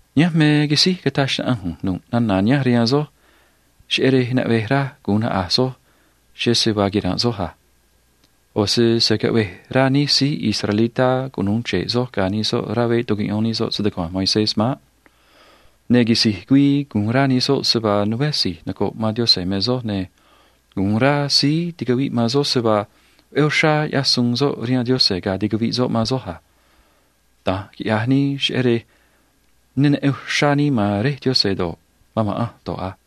“Nihánj me quisíj cataj xnaꞌanj ꞌu̱nj nu̱ꞌ nana̱ nihánj rihaan soj, cheꞌé rej naꞌvej raj gu̱un naꞌa̱j soj cheꞌé se vaa quira̱nꞌ soj a. ꞌO̱ se se̱ caꞌvej rá nij síí israelitá cunu̱u chre̱ꞌ soj ga̱ nij soꞌ rá veꞌ tucuꞌyón nij soꞌ se‑tucua̱nj Moisés maꞌ. Ne̱ quisi̱j güii gu̱un rá nij soꞌ se vaa nuveé si̱j noco̱ꞌ man Diose̱ me soj, ne̱ gu̱un rá síí ticaviꞌ man soj se vaa veꞌé uxrá ꞌyaj suun soꞌ rihaan Diose̱ ga̱a ticaviꞌ soꞌ man soj a. Da̱nj quiꞌya̱j nii, cheꞌé rej ne neꞌen uxrá nii man Réj Diose̱ do̱ꞌ, man ma̱ꞌanj do̱ꞌ a.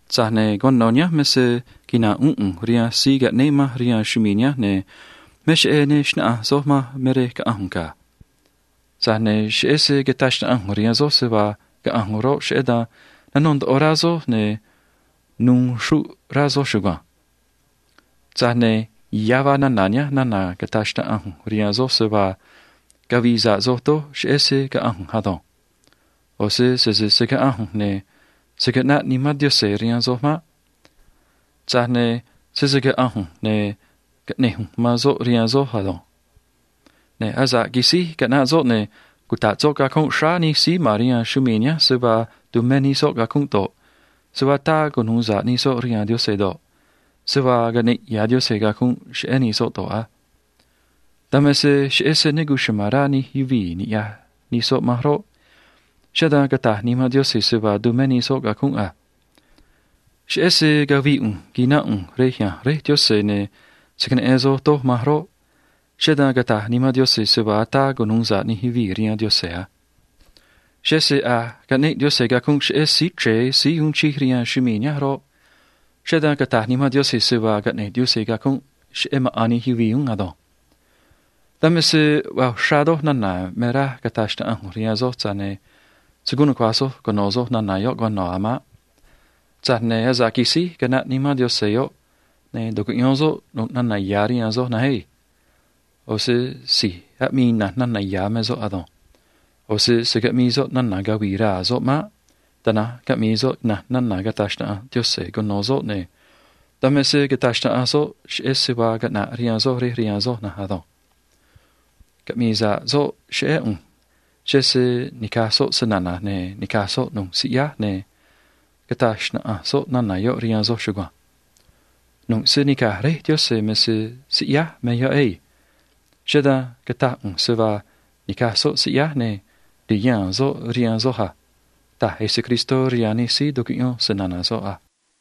Tza̱j ne̱ cuano̱ nihánj me se quina̱nꞌ uún ꞌu̱nj rihaan síí caꞌnéé manj rihaan chumii̱ nihánj, ne̱ me cheꞌé ne xnáꞌanj soj manj me rej caꞌa̱nj ꞌu̱nj ga̱. Tza̱j ne̱ cheꞌé se cataj xnaꞌanj ꞌu̱nj rihaan soj se vaa caꞌa̱nj ꞌu̱nj roꞌ, cheꞌé dan nanó ndoꞌo rá soj ne̱ nu̱u̱ xruꞌ rá soj chugua̱nj. Tza̱j ne̱ ya̱ vaa nana̱ nihánj nana̱ cata̱j xnaꞌanj ꞌu̱nj rihaan soj, se vaa cavi̱i̱ sa̱ꞌ soj doj cheꞌé se caꞌa̱nj ꞌu̱nj ado̱nj. ꞌO̱ se sese se̱ caꞌanj ꞌu̱nj, ne̱ se̱ caꞌnaꞌ Nimán Diose̱ rihaan soj maꞌ. Tza̱j ne̱ sese caꞌa̱nj ꞌu̱nj, ne̱ caꞌne̱j ꞌu̱nj man soꞌ rihaan soj ado̱nj. Ne̱ asa̱ꞌ quisíj caꞌnaꞌ soꞌ, ne̱ cuta̱ꞌ soꞌ cacunꞌ xráá nij síí ma̱n rihaan chumii̱ nihánj se vaa tumé nij soꞌ cacunꞌ do̱ꞌ, se vaa ataa cunu̱u sa̱ꞌ nij soꞌ rihaan Diose̱ do̱ꞌ, se vaa caꞌne̱ꞌ ya̱ Diose̱ cacunꞌ cheꞌé nij soꞌ do̱ꞌ a. Dan me se cheꞌé se ne cuchuma̱n rá nij yuvii̱ ni̱ꞌyaj nij soꞌ manj roꞌ, cheꞌé dan cata̱j Nimán Diose̱ se vaa tumé nij soꞌ cacunꞌ a. Cheꞌé se cavi̱i̱ ꞌu̱nj qui̱nánꞌ ꞌu̱nj rej ya̱nj Réj Diose̱ ne̱ se̱ queneꞌen soj doj manj roꞌ, cheꞌé dan cata̱j Nimán Diose̱ se vaa ataa cunu̱u sa̱ꞌ nij yuvii̱ rihaan Diose̱ a. Cheꞌé se a̱j caꞌneꞌ Diose̱ cacunꞌ cheꞌé síí chre̱e síí uun chij rihaan chumii̱ nihánj roꞌ, cheꞌé dan cata̱j Nimán Diose̱ se vaa caꞌne̱ꞌ Diose̱ cacunꞌ cheꞌé maꞌa̱n nij yuvii̱ uún ado̱nj. “Dan me se vaa uxrá doj nana̱ me raj cata̱j xnaꞌanj ꞌu̱nj rihaan soj, tza̱j ne̱ se̱ guun nucua̱j soj cuno̱ soj nana̱ yoꞌ cuano̱ a̱ maꞌ. Tza̱j ne̱ asa̱ꞌ quisíj caꞌnaꞌ Nimán Diose̱ yoꞌ, ne̱ tu̱cuꞌyón soꞌ nu̱ꞌ nana̱ ya̱ rihaan soj na̱nj ei. ꞌO̱ se si̱j aꞌmii ina̱nj nana̱ ya̱ me soꞌ ado̱nj. ꞌO̱ se se̱ caꞌmii soꞌ nana̱ cavi̱i̱ raa̱ soꞌ maꞌ. Tana̱nj caꞌmi̱i̱ soꞌ ina̱nj nana̱ cata̱j xnaꞌanj Diose̱ cuno̱ soꞌ, ne̱ dan me se cata̱j xnaꞌanj soꞌ cheꞌé se vaa caꞌna̱ꞌ rihaan soj rej rihaan soj na̱nj ado̱nj. Caꞌmi̱i̱ sa̱ꞌ soꞌ cheꞌé ꞌu̱nj, cheꞌé se ni̱caj soꞌ se‑na̱na̱j, ne̱ ni̱caj soꞌ nu̱ꞌ siꞌyáj, ne̱ cata̱j xnaꞌanj soꞌ nana̱ yoꞌ rihaan soj chugua̱nj. Nu̱ꞌ se nica̱j Réj Diose̱ me se siꞌyáj me yoꞌ ei. Cheꞌé dan cataj ꞌu̱nj se vaa ni̱caj soꞌ siꞌyáj, ne̱ ti̱haa̱n soꞌ rihaan soj a ―taj Jesucristó rihaan nij síí tucuꞌyón se‑na̱na̱ soꞌ a.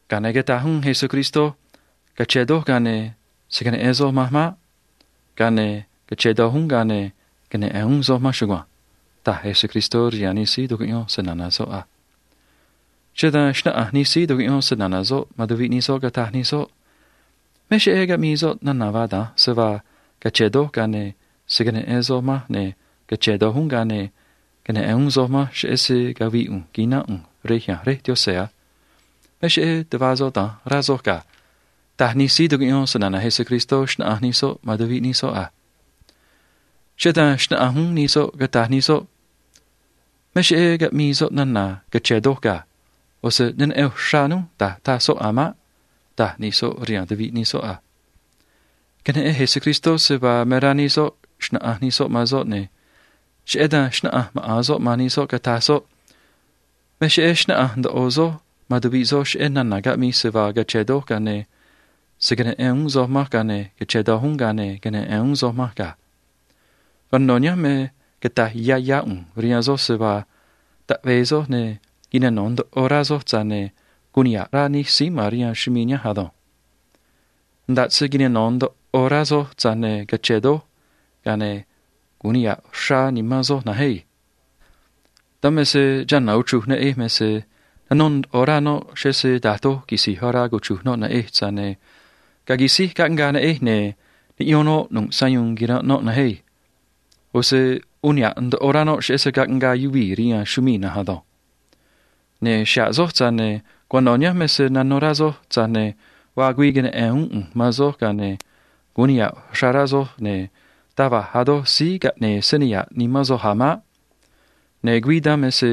Ga̱a ne̱ cataj uún Jesucristó: ―Cache̱n doj, ga̱a ne̱ se̱ queneꞌen soj manj maꞌ. Ga̱a ne̱ cache̱n doj uún, ga̱a ne̱ queneꞌe̱n uún soj manj chugua̱nj ―taj Jesucristó rihaan nij síí tucuꞌyón se‑na̱na̱ soꞌ a. Cheꞌé dan xnáꞌanj nij síí tucuꞌyón se‑na̱na̱ soꞌ man tuviꞌ nij soꞌ, cataj nij soꞌ: ―Me cheꞌé caꞌmii soꞌ nana̱ vaa da̱nj se vaa, “Cache̱n doj, ga̱a ne̱ se̱ queneꞌen soj manj, ne̱ cache̱n doj uún, ga̱a ne̱ queneꞌe̱n uún soj manj, cheꞌé se cavi̱i̱ ꞌu̱nj qui̱nánꞌ ꞌu̱nj rej ya̱nj Réj Diose̱ a”. Me cheꞌé tuꞌva soꞌ da̱nj, rá soj ga̱ ―taj nij síí tucuꞌyón se‑na̱na̱ Jesucristó, xnáꞌanj nij soꞌ man tuviꞌ nij soꞌ a. Cheꞌé dan xnáꞌanj uún nij soꞌ, cataj nij soꞌ: ―Me cheꞌé caꞌmii soꞌ nana̱ “cache̱n doj” ga̱. ꞌO̱ se ne neꞌen uxrá núj da̱j taj soꞌ a̱ maꞌ ―taj nij soꞌ rihaan tuviꞌ nij soꞌ a. Queneꞌen Jesucristó se vaa me rá nij soꞌ xna̱ꞌanj nij soꞌ man soꞌ, ne̱ cheꞌé dan xnáꞌanj maꞌa̱n soꞌ man nij soꞌ, cataj soꞌ: ―Me cheꞌé xnáꞌanj ndoꞌo soj man tuviꞌ soj cheꞌé nana̱ caꞌmij, se vaa cache̱n doj, ga̱a ne̱ se̱ queneꞌen uún soj manj, ga̱a ne̱ cache̱n doj uún, ga̱a ne̱ queneꞌe̱n uún soj manj ga̱. Cuano̱ nihánj me cata̱j yá yá ꞌu̱nj rihaan soj se vaa taꞌve̱e soj ne̱ quinano̱ ndoꞌo rá soj, tza̱j ne̱ gu̱un niha̱ꞌ rá nij síí ma̱n rihaan chumii̱ nihánj ado̱nj. Nda̱ꞌ se quinano̱ ndoꞌo rá soj, tza̱j ne̱ cache̱n doj, ga̱a ne̱ gu̱un niha̱ꞌ uxrá nimán soj na̱nj ei. Dan me se chana̱ uchruj neꞌej me se nanó ndoꞌo rá noꞌ, cheꞌé se da̱j doj quisi̱j orá cuchru̱j noꞌ neꞌej, tza̱j ne̱ ga̱a quisíj caꞌngaa neꞌej, ne̱ niꞌyón noꞌ nu̱ꞌ sayuun quiranꞌ noꞌ na̱nj ei. ꞌO̱ se uun niha̱ꞌ ndoꞌo rá noꞌ cheꞌé se caꞌngaa yuvii̱ rihaan chumii̱ na̱nj ado̱nj. Ne̱ xa̱ꞌ soj, tza̱j ne̱ cuano̱ nihánj me se nanó rá soj, tza̱j ne̱ vaa güii queneꞌe̱n uún ꞌu̱nj man soj, ga̱a ne̱ gu̱un niha̱ꞌ uxrá rá soj, ne̱ taj va̱j a̱ doj síí caꞌne̱e̱ se niha̱ꞌ nimán soj a̱ maꞌ. Ne̱ güii dan me se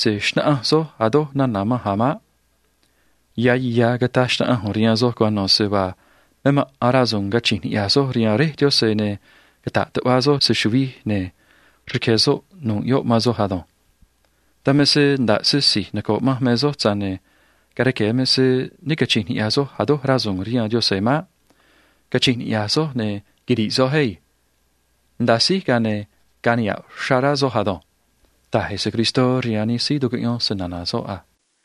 se̱ xnáꞌanj soj a̱ doj nana̱ manj a̱ maꞌ. Ya̱ ya̱ cata̱j xnaꞌanj ꞌu̱nj rihaan soj cuano̱ se vaa me maꞌa̱n rasu̱u̱n cachi̱nj niꞌya̱j soj rihaan Réj Diose̱ ne̱ cata̱ꞌ tuꞌva soj se‑chu̱vij, ne̱ rque̱ soꞌ nu̱ꞌ yoꞌ man soj ado̱nj. Dan me se nda̱ꞌ se si̱j noco̱ꞌ manj me soj, tza̱j ne̱ ga̱a rque̱ me se ne cachi̱nj niꞌya̱j soj a̱ doj rasu̱u̱n rihaan Diose̱ maꞌ. Cachi̱nj niꞌya̱j soj, ne̱ quiri̱ꞌ soj ei. Nda̱a síj, ga̱a ne̱ ga̱a̱ niha̱ꞌ uxrá rá soj ado̱nj ―taj Jesucristó rihaan nij síí tucuꞌyón se‑na̱na̱ soꞌ a.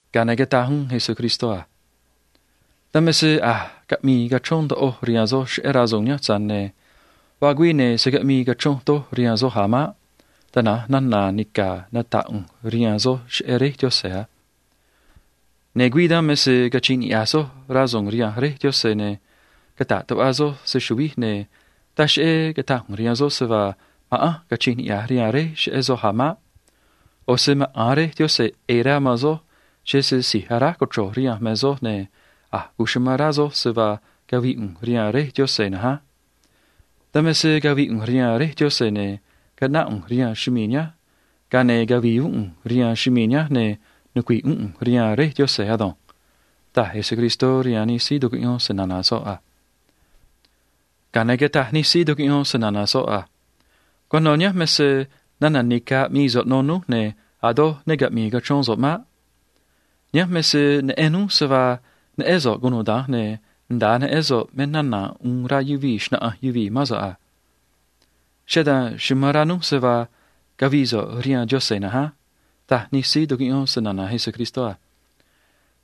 Ga̱a ne̱ cataj uún Jesucristó a: ―Dan me se a̱j caꞌmii cachrón ndoꞌoj rihaan soj cheꞌé rasu̱u̱n nihánj, tza̱j ne̱ vaa güii, ne̱ se̱ caꞌmii cachronj doj rihaan soj a̱ maꞌ. Tana̱nj nana̱ nica̱ nata̱ꞌ ꞌu̱nj rihaan soj cheꞌé Réj Diose̱ a. Ne̱ güii dan me se cachi̱nj niꞌya̱j soj rasu̱u̱n rihaan Réj Diose̱, ne̱ cata̱ꞌ tuꞌva soj se‑chu̱vij, ne̱ taj cheꞌé cata̱j ꞌu̱nj rihaan soj se vaa ma̱ꞌanj cachi̱nj niꞌya̱j rihaan Réj cheꞌé soj a̱ maꞌ. ꞌO̱ se maꞌa̱n Réj Diose̱ ꞌe̱e̱ rá man soj, cheꞌé se si̱j aráj cochro̱j rihanj me soj, ne̱ amán rá soj se vaa cavii ꞌu̱nj rihaan Réj Diose̱ na̱nj á. Dan me se cavii ꞌu̱nj rihaan Réj Diose̱, ne̱ caꞌnáꞌ ꞌu̱nj rihaan chumii̱ nihánj, ga̱a ne̱ cavi̱i̱ uún ꞌu̱nj rihaan chumii̱ nihánj, ne̱ nucui̱ꞌ uún ꞌu̱nj rihaan Réj Diose̱ ado̱nj ―taj Jesucristó rihaan nij síí tucuꞌyón se‑na̱na̱ soꞌ a. Ga̱a ne̱ cataj nij síí tucuꞌyón se‑na̱na̱ soꞌ a: ―Cuano̱ nihánj me se nana̱ nica̱ aꞌmii so̱ꞌ no núj, ne̱ a̱ doj ne caꞌmi̱i̱ cachrón so̱ꞌ maꞌ. Nihánj me se neꞌen núj se vaa neꞌén so̱ꞌ cunuda̱nj, ne̱ nda̱a neꞌén so̱ꞌ me nana̱ uun rá yuvii̱ xna̱ꞌanj yuvii̱ mán so̱ꞌ a. Cheꞌé dan amán rá núj se vaa cavii so̱ꞌ rihaan Diose̱ na̱nj á ―taj nij síí tucuꞌyón se‑na̱na̱ Jesucristó a.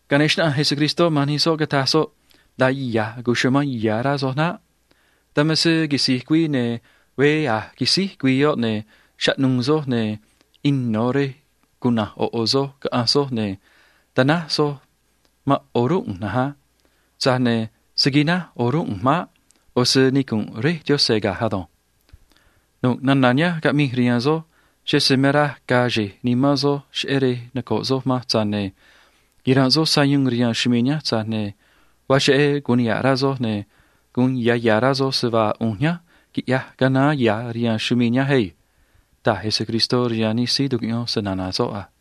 Ga̱a ne̱ xnáꞌanj Jesucristó man nij soꞌ, cataj soꞌ: ―Nda̱a ya̱j cuchumán ya̱ rá soj naꞌ. Dan me se quisi̱j güii, ne̱ veé a̱j quisíj güii yoꞌ, ne̱ chaꞌnu̱u̱ soj, ne̱ ino̱ rej cuna̱nj ꞌo̱ ꞌo̱ soj, caꞌa̱nj soj, ne̱ ta̱náj soj man o̱rúnꞌ ꞌu̱nj na̱nj á. Tza̱j ne̱ se̱ quináj o̱rúnꞌ ꞌu̱nj maꞌ. ꞌO̱ se nicu̱nꞌ Réj Diose̱ ga̱j ado̱nj. Nu̱ꞌ nana̱ nihánj caꞌmij rihaan soj, cheꞌé se me raj ga̱a̱ xe̱j nimán soj cheꞌé rej noco̱ꞌ soj manj, tza̱j ne̱ quira̱nꞌ soj sayuun rihaan chumii̱ nihánj, tza̱j ne̱ vaa cheꞌé gu̱un niha̱ꞌ rá soj, ne̱ gu̱un ya̱ ya̱ rá soj se vaa ꞌu̱nj nihánj quiꞌyaj canaán ya̱ rihaan chumii̱ nihánj ei ―taj Jesucristó rihaan nij síí tucuꞌyón se‑na̱na̱ soꞌ a.